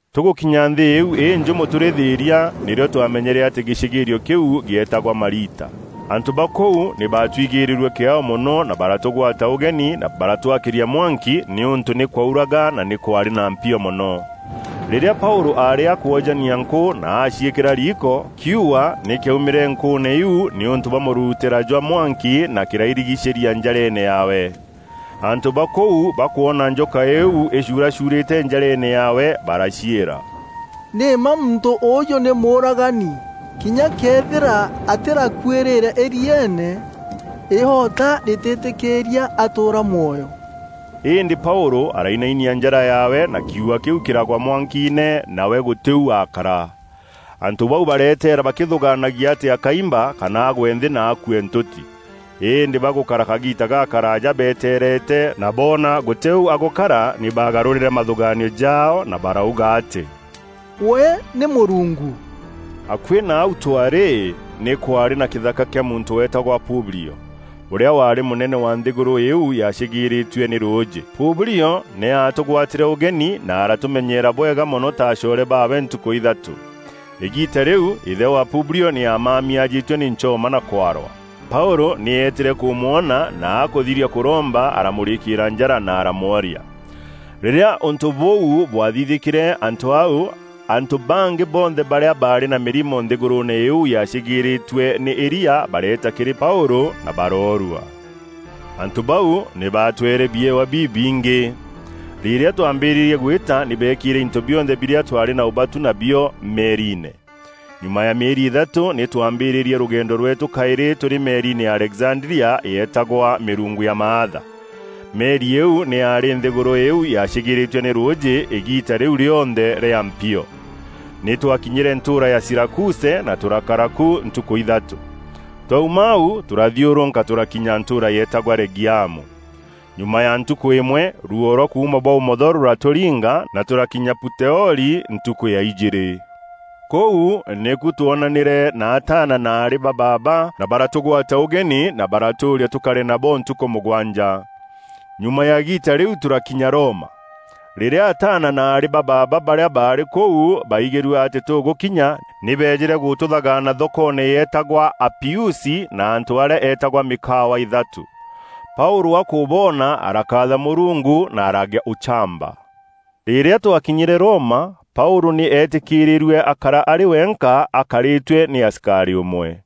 Tûgûkinya nthî îîu înjûmo tûrî thîîria, nîrîo twamenyere atî gîcîgîîrio kîu gîeetagwa Malita. Antû ba kûu nî baatwigîîrîrue kîaao mono na baratûgwata ûgeni na baratwakîria mwanki nîûntû nî kwaûraga na nî kwaarî na mpio mono. Rîrîa Paûlû aarî akwojania nkû na aaciîkîra riiko, kiuua nî kîaumîre nkûûne iu nîûntû bwa mûruutîra jwa mwanki, na kîrairigicîria njareene yaawe. Antû ba kûu bakwona njoka îîu îcuuracuurîte njareene yaawe, baraciîra, “Nî mma muntû ûûjû nî mûûragani. Kinya këethîra atîrakuîrîîre îrieene, îota rîtîtîkîîria atûûra mwoyo.” Îndî Paûlû arainainia njara yaawe na kiuua kîu kîragwa mwankiine, nawe gûtî u aakara. Antû bau bareteera bakîthûgaanagia atî akaimba kana agwe nthî na akue ntûti. Îndî bagûkara kagiita gakaraaja beteerete na boona gûtî u agûkara nî baagarûrîre mathûgaanio jaao na barauga atî “We nî mûrungu.” Akuî na au twaarî, nî kwaarî na kîthaka kîa muntû weetagwa Publio, ûrîa waarî mûnene wa nthîgûrû îîu yaacîgîîrîîtue nî rûûjî. Publio nî aatûgwatîre ûgeni na aratûmenyeera bwega mono ta acoore baawe ntukû ithatû. Îgiita rîu îthe wa Publio nî aamami aajîtue nî nchoma na kwarwa. Paûlû nî eetîre kûmwona, na akûthiria kûromba, aramûrikîîra njara na aramworia. Rîrîa ûntû bûu bwathithîkîre antû au, antû bangî bonthe barîa baarî na mîrimo nthîgûrûûne îîu yaacîgîîrîîtue nî îria bareeta kîrî Paûlû na baroorua. Antû bau nî baatweere biewa bibingî. Rîrîa twaambîrîrie gwîta nî beekîîre into bionthe birîa twaarî na ûbatu nabio meeriine. Nyuma ya mîeri îthatû nî twaambîrîîrie rûgendo rweetû kaîrî tûrî meeriine ya Alexandria yeetagwa, Mîrungu ya Maatha. Meri îîu nî yaarî nthîgûrû îîu yaacîgîîrîîtue nî rûûjî îgiita rîu rîonthe rîa mpio. Nî twakinyîre ntûûra ya Sirakuse, na tûrakara ku ntukû ithatû. Twauma au, tûrathiûrûka tûrakinya ntûûra yeetagwa Regiamu. Nyuma ya ntukû îmwe, ruuo rwa kuuma bwa ûmotho rûratûringa na tûrakinya Puteoli ntukû ya ijîîrî. Kûu nîku twoonanîre na ataana na aarî ba baaba, na baratûgwata ûgeni na baratûûria tûkare nabo ntukû mûgwanja. Nyuma ya îgiita rîu, tûrakinya Roma. Rîrîa ataana na aarî ba baaba barîa baarî kûu, baigîrue atî tûgûkinya, nî beejîre gûtûthagaana thokoone yeetagwa Apiusi na antû arîa eetagwa Mîkawa Îthatû. Paûlû akûboona arakaatha Mûrungu na aragîa ûchamba. Rîrîa twakinyîre Roma, Paûlû nî eetîkîrîîrue akara arî wenka, akarîtue nî asikarî ûmwe.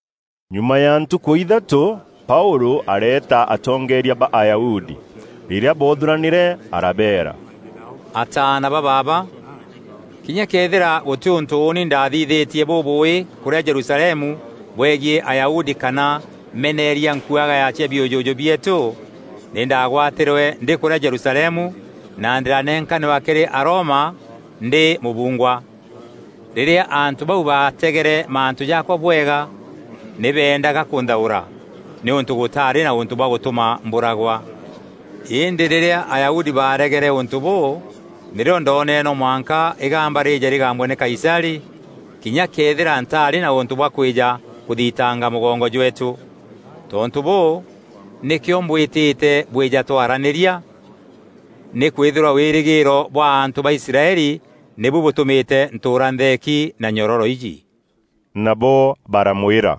Nyuma ya ntukû ithatû, Paûlû areeta atongeeria ba Ayahudi. Rîrîa boothûranîre arabeera, “Ataana ba baaba, kinya këethîra gûtî ûntû ûûni ndaathithîtie bûbûûî kûrîa Jerusalemu bwegiî Ayahudi kana meneeria nkuagaya cia biûjûjû bieetû, nî ndaagwatîrwe ndî kûrîa Jerusalemu na ndîranenkanîrwa kîrî Aroma ndî mûbungwa. Rîrîa antû bau baategere mantû jaakwa bwega, nî beendaga kûnthaûra, nîûntû gûtaarî na ûntû bwa gûtûma mbûragwa. Îndî rîrîa Ayahudi baaregere ûntû bûû, nîrîo ndoonere no mwanka îgamba rîîje rîgambwe nî Kaisarî, kinya këethîra ntaarî na ûntû bwa kwîja kûthitanga mûgongo jweetû. Tontû bûû, nîkîo mbwîtîte bwîja twaranîria; nîkwîthîrwa wîrîgîîro bwa antû ba Israeli nîbu bûtûmîte ntûûra ntheeki na nyororo iji.” Nabo baramwîra,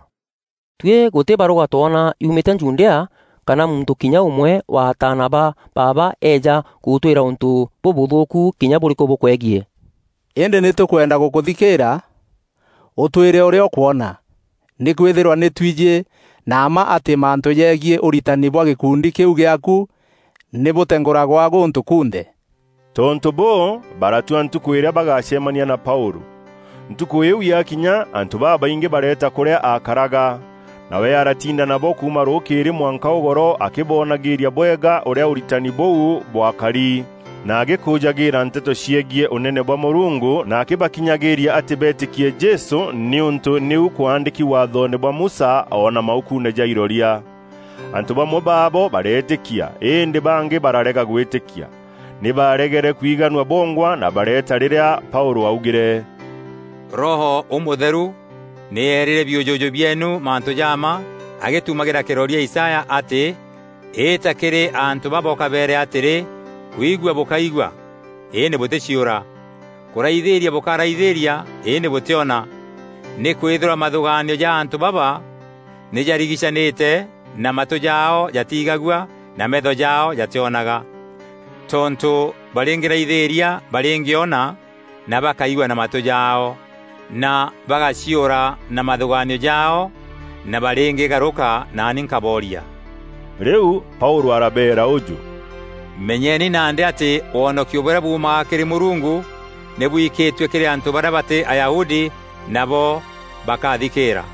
“Tuî gûtî barûga twona yuumîte Judea, kana muntû kinya ûmwe wa ataana ba baaba eeja gûtwîra ûntû bûbûthûûku kinya bûrîkû bûkwegiî. Îndî nî tûkwenda gûkûthikîîra ûtwîre ûrîa ûkwona. Nîkwîthîrwa nî twijî na mma atî mantû jegiî ûritani bwa gîkundi kîû gîaaku, nî bûtengûragwa gûntû kunthe.” Tontû bûû, baratua ntukû îrîa bagacemania na Paûlû. Ntukû îîu yakinya, antû babaingî bareeta kûrîa aakaraga. Nawe aratinda nabo kuuma rûkîîrî mwanka ûgoro akîboonagîîria bwega ûrîa ûritani bûu bwakari, na agîkûûjagîîra nteto ciegiî Ûnene bwa Mûrungu, na akîbakinyagîîria atî beetîkie Jesû nîûntû nîu kwaandîki Waathoone bwa Musa o na maukuune ja iroria. Antû bamwe baabo bareetîkia, îndî bangî bararega gwîtîkia. Nî baaregere kwiganua bongwa na bareeta, rîrîa Paûlû augîre, “Roho Ûmûtheru nî eerîre biûjûjû bieenu mantû ja mma agîtumagîra kîroria Isaya atî: Îta kîrî antû baba ûkabeere atîrî, kwigua bûkaigua, îndî bûtîciûra; kûraithîîria bûkaraithîria îndî bûtiona. Nîkwîthîrwa mathûgaanio ja antû baba nî jarigicanîte, na matû jaao jatiigagua, na meetho jaao jatîonaga. Tontû, barîngîraithîîria barîngîona, na bakaigua na matû jaao, na bagaciûra na mathûgaanio jaao, na barîngîgarûka naani nkabooria.” Rîu Paûlû arabeera ûjû, “Menyeni nandî atî wonokio bûrîa buumaga kîrî Mûrungu nî bwikîtue kîrî antû barîa batî Ayahudi, nabo bakathikîîra.” [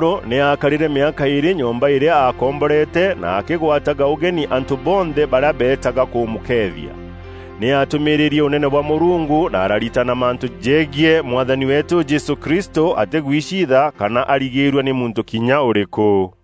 Paûlû nî aakarîre mîaka îîrî nyomba îrîa aakomborete, na akîgwataga ûgeni antû bonthe barîa beetaga kûmûkeethia. Nî aatûmîîrîrie Ûnene bwa Mûrungu na araritana mantû jegiî Mwathani weetû Jesû Kristû atîguiciitha kana arigîrua nî muntû kinya ûrîkû.